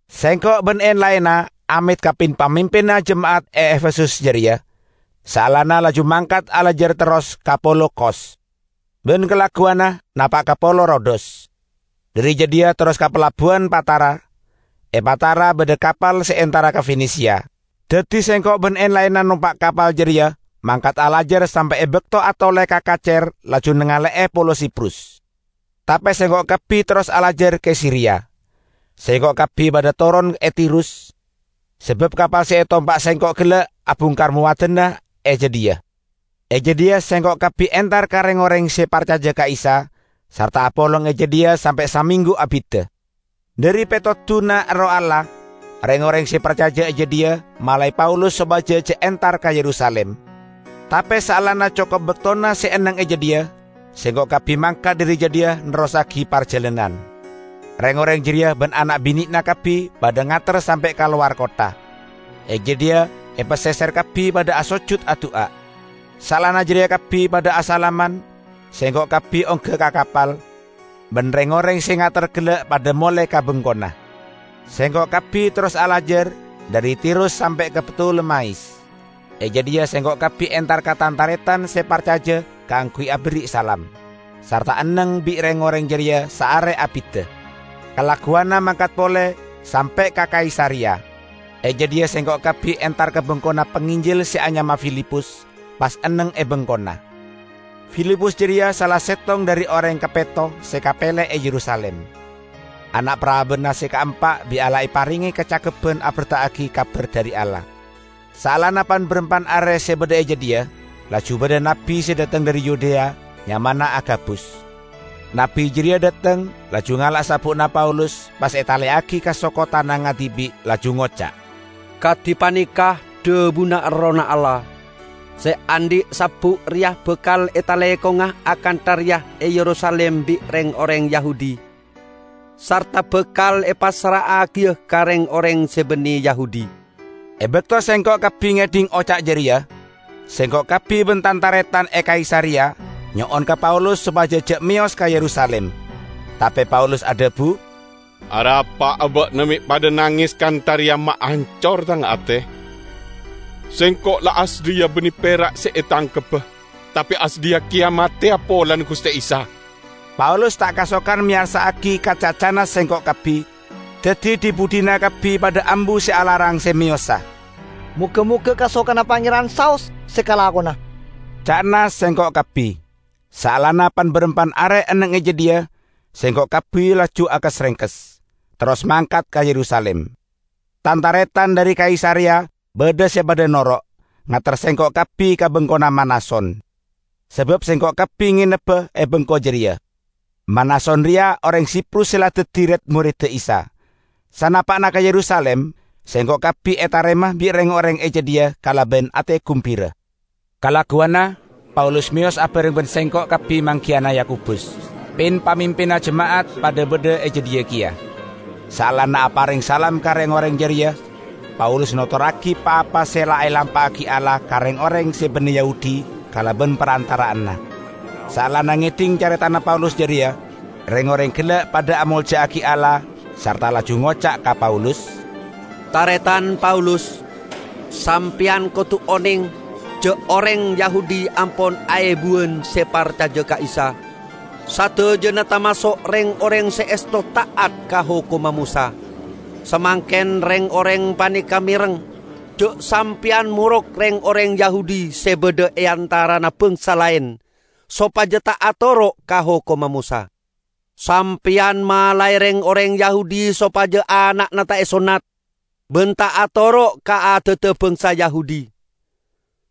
Sengko' ban en-laenna amet ka pin-pamimpinna jema'at e Efesus jareya, saellana, laju mangkat alajar terros ka polo Kos; ban kalagguwanna napa' ka polo Rodos. Dhari jadhiya terros ka palabbuwan Patara. E Patara badha kapal se entara ka Fenesia. Daddi sengko' ban en-laenna nompa' kapal jareya mangkat alajar sampe' e bakto atole ka kacer laju nangale'e polo Siprus; tape sengko' kabbi terros alajar ka Siria. Sengko' kabbi padha toron e Tirus, sabab kapal se etompa' sengko' gella' abungkar mowadanna e jadhiya. E jadhiya sengko' kabbi entar ka reng-oreng se parcaja ka Isa, sarta apolong e jadhiya sampe' samenggu abidda. Dhari petoduna Erroh Allah, reng-oreng se parcaja e jadhiya malae Paulus sopaja ja' entar ka Yerusalim. Tape saellana cokop baktona se enneng e jadhiya, sengko' kabbi mangkat dhari jadhiya nerrossagi parjalanan. Reng-oreng jareya ban ana' binena kabbi padha ngater sampe' kalowar kottha. E jadhiya, e paseser kabbi padha asojut adu'a. Saellana jareya kabbi padha asalaman; sengko' kabbi ongga ka kapal, ban reng-oreng se ngater gella' padha mole ka bengkona. Sengko' kabbi terros alajar dhari Tirus sampe' ka Ptolemais. E jadhiya sengko' kabbi entar ka tan-taretan se parcaja kaangguy aberri' salam, sarta enneng bi' reng-oreng jareya saare abidda. Kalagguwanna mangkat pole, sampe' ka Kaisareya. E jadhiya sengko' kabbi entar ka bengkona panginjil se anyama Filipus, pas enneng e bengkona. Filipus jareya sala settong dhari oreng kapetto se kapele e Yerusalim. Ana' parabanna se kaempa bi' Allah eparenge kacakebban aberta'agi kabar dhari Allah. Saellana pan-barampan are se badha e jadhiya, laju badha nabbi se dhateng dhari Yudea, nyamana Agabus. Nabbi jareya dhateng, laju ngala' sabbu'na Paulus, pas etaleyagi ka soko tanangnga dibi', laju ngoca', "Kadi paneka dhabuna Errohna Allah: Se andhi' sabbu' reya bakal etalekonga akantha reya e Yerusalim bi' reng-oreng Yahudi, sarta bakal epassra'agiya ka reng-oreng se banne Yahudi." E bakto sengko' kabbi ngedhing oca' jareya, sengko' kabbi ban tan-taretan e Kaisareya nyo'on ka Paulus sopaja ja' meyos ka Yerusalim. Tape Paulus adhabu, "Arapa'a ba'na me' padha nanges kantha reya, maancor tang ate? Sengko' la asadhiya banne pera' se etangkebba, tape asadhiya keya mateya polana Guste Isa." Paulus ta' kasokan meyarsa'agi ka cacana sengko' kabbi, daddi dhi-budhina kabbi padha ambu se alarang se meyosa. "Moga-moga kasokanna Pangeran saos se kalakona," ca'na sengko' kabbi. Saellana pan-barampan are enneng e jadhiya, sengko' kabbi laju akes-rengkes, terros mangkat ka Yerusalim. Tan-taretan dhari Kaisareya badha se padha noro', ngater sengko' kabbi ka bengkona Manason, sabab sengko' kabbi ngenebba e bengko jareya. (Manason reya oreng Siprus se la daddi red-moredda Isa.) Sanapa'na ka Yerusalim, sengko' kabbi etarema bi' reng-oreng e jadhiya kalaban ate gumbira. Kalagguwanna Paulus meyos abareng ban sengko' kabbi manggiyana Yakobus; pin-pamimpinna jema'at padha badha e jadhiya keya. Saellana apareng salam ka reng-oreng jareya, Paulus notorragi pa-apa se la elampa'agi Allah ka reng-oreng se banne Yahudi kalaban parantara'anna. Saellana ngedhing caretana Paulus jareya, reng-oreng gella' padha amolja'agi Allah sarta laju ngoca' ka Paulus, "Taretan Paulus! Sampeyan kodu oneng ja' oreng Yahudi ampon aebuwan se parcaja ka Isa. Sadajana tamaso' reng-oreng se esto ta'at ka hokomma Mosa. Samangken reng-oreng paneka mereng ja' sampeyan morok reng-oreng Yahudi se badha e antarana bangsa laen sopaja ta' atoro' ka hokomma Mosa. Sampeyan malae reng-oreng Yahudi sopaja ana'na ta' esonnat, ban ta' atoro' ka adadda bangsa Yahudi.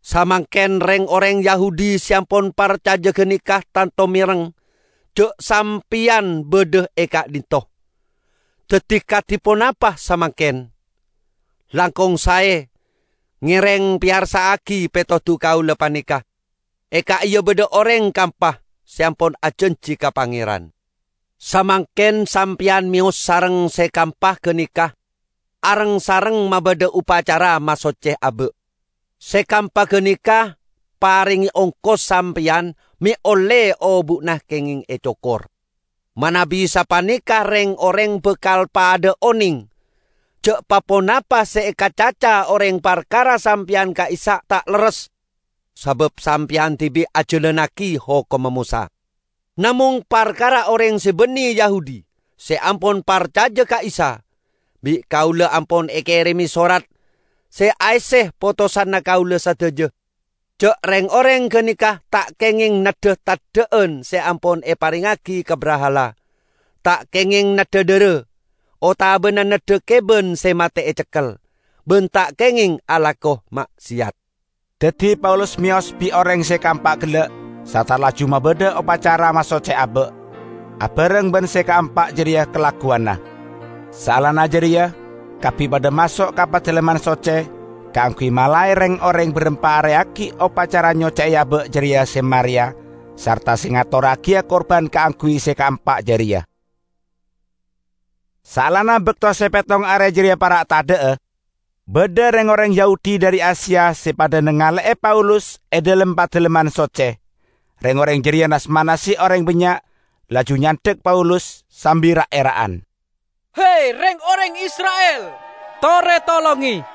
Samangken reng-oreng Yahudi se ampon parcaja ganeka tanto mereng ja' sampeyan badha e ka'dhinto'. Daddi, kadi ponapa samangken? Langkong sae, ngereng peyarsa'agi petodu kaula paneka. E ka'iya badha oreng kaempa se ampon ajanji ka Pangeran. Samangken sampeyan meyos sareng se kaempa ganeka areng-sareng mabadha opacara masocce aba'; se kaempa ganeka parenge ongkos sampeyan me' olle obu'na kengeng ecokor. Manabi sapaneka reng-oreng bakal padha'a oneng ja' pa-ponapa se ekacaca oreng parkara sampeyan ka'issa' ta' lerres, sabab sampeyan dibi' ajalannagi hokomma Mosa. Namong, parkara oreng se banne Yahudi se ampon parcaja ka Isa, bi' kaula ampon ekereme sorat se aesse potosanna kaula sadaja ja' reng-oreng ganeka ta' kengeng neddha teddha'an se ampon eparengngagi ka brahala, ta' kengeng neddha dhara, otabana neddha keban se mate ecekkel; ban ta' kengeng alako ma'seyat." Daddi Paulus meyos bi' oreng se kaempa gella' sarta laju mabadha opacara masocce aba' abareng ban se kaempa jareya kalagguwanna. Saellana jareya kabbi padha maso' ka Padalemman Socce kaangguy malae reng-oreng barampa are aggi' opacara nyocce'e aba' jareya se mareya sarta se ngatorragiya kurban kaangguy se kaempa jareya. Saellana bakto se pettong are jareya para' tadha'a, badha reng-oreng Yahudi dhari Asia se padha nangale'e Paulus e dhalem Padalemman Socce. Reng-oreng jareya nas-manase oreng bannya', laju nyandhak Paulus, sambi ra'-era'an, "He, reng-oreng Isra'il, tore tolonge!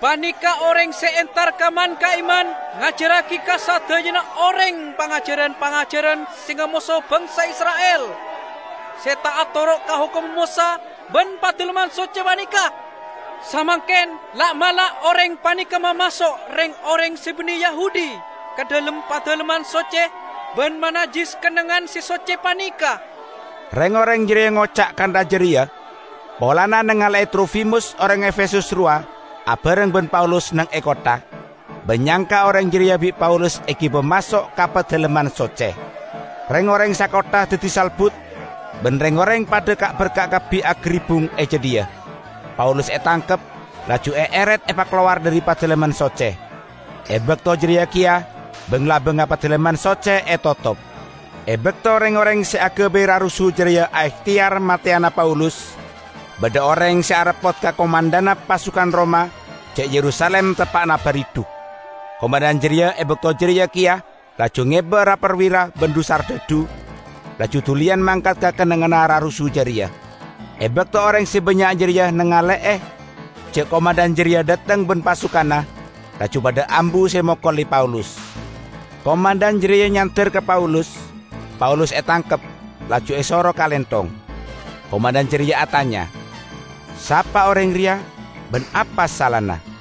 Paneka' oreng se entar ka man-ka'imman ngajarragi ka sadajana oreng pangajaran-pangajaran se ngamoso bangsa Isra'il, se ta' atoro' ka hokomma Mosa ban Padalemman Socce paneka. Samangken la'-mala' oreng paneka mamaso' reng-oreng se banne Yahudi ka dhalem Padalemman Socce ban manajjis kennengngan se socce paneka!" ( Reng-oreng jareya ngoca' kantha jareya polana nangale'e Trofimus oreng Efesus rowa abareng ban Paulus neng e kottha, ban nyangka oreng jareya bi' Paulus egiba maso' ka Padalemman Socce.) Reng-oreng sakottha daddi salbut, ban reng-oreng padha ka'-berka' kabbi agaribbung e jadhiya. Paulus etangkep, laju eeret epakalowar dhari Padalemman Socce. E bakto jareya keya bang-labangnga Padalemman Socce etotop. E bakto reng-oreng se agabay rarusu jareya aehteyar mateyana Paulus, badha oreng se areppot ka komandhanna pasukan Roma ja' Yerusalim teppa'na baridhu. Komandhan jareya e bakto jareya keya laju ngeba ra-parwira ban dhu-sardhadhu, laju duliyan mangkat ka kennengnganna rarusu jareya. E bakto oreng se bannya' jareya nangale'e ja' komandhan jareya dhateng ban pasukanna, laju padha ambu se mokole Paulus. Komandhan jareya nyander ka Paulus; Paulus etangkep, laju esoro kalenthong. Komandhan jareya atanya, "Sapa oreng reya, ban apa salana?"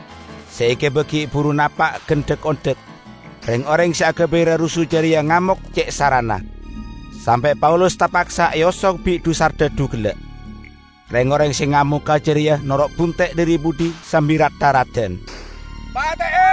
Se egiba gi' buru napa' gan dhak-ondhak, reng-oreng se agabay rarusu jareya ngamok ce' sarana, sampe' Paulus tapaksa eosong bi' dhu-sardhadhu gella'. Reng-oreng se ngamoga jareya noro' bunte' dhari budhi sambi rat-tharadan, "Pate'e!"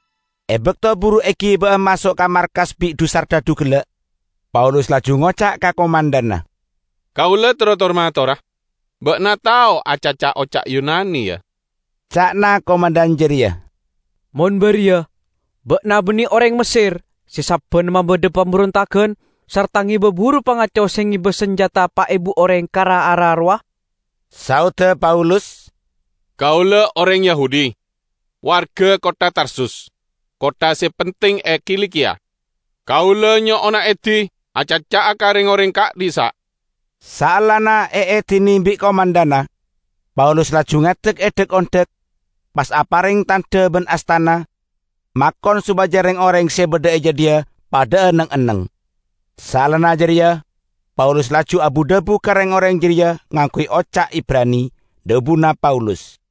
E bakto buru egiba'a maso' ka markas bi' dhu-sardhadhu gella', Paulus laju ngoca' ka komandhanna, "Kaula terro tor-matora." "Ba'na tao acaca oca' Yunani, ya?" ca'na komandhan jareya. "Mon bariya ba'na banne oreng Messer se sabbanna mabadha pamberontagan sarta ngeba buru pangaco se ngeba sanjata pa' ebu oreng ka ra-ara rowa?" Saodda Paulus, "Kaula oreng Yahudi, warga kottha Tarsus, kottha se penting e Kilikiya. Kaula nyo'ona edi acaca'a ka reng-oreng ka'dhissa'." Saellana eedine bi' komandhanna, Paulus laju ngadek e dhak-ondhak, pas apareng tandha ban astana, makon sopaja reng-oreng se badha e jadhiya padha'a neng-enneng. Saellana jareya Paulus laju abu-dhabu ka reng-oreng jareya ngangguy oca' Ibrani. Dhabuna Paulus,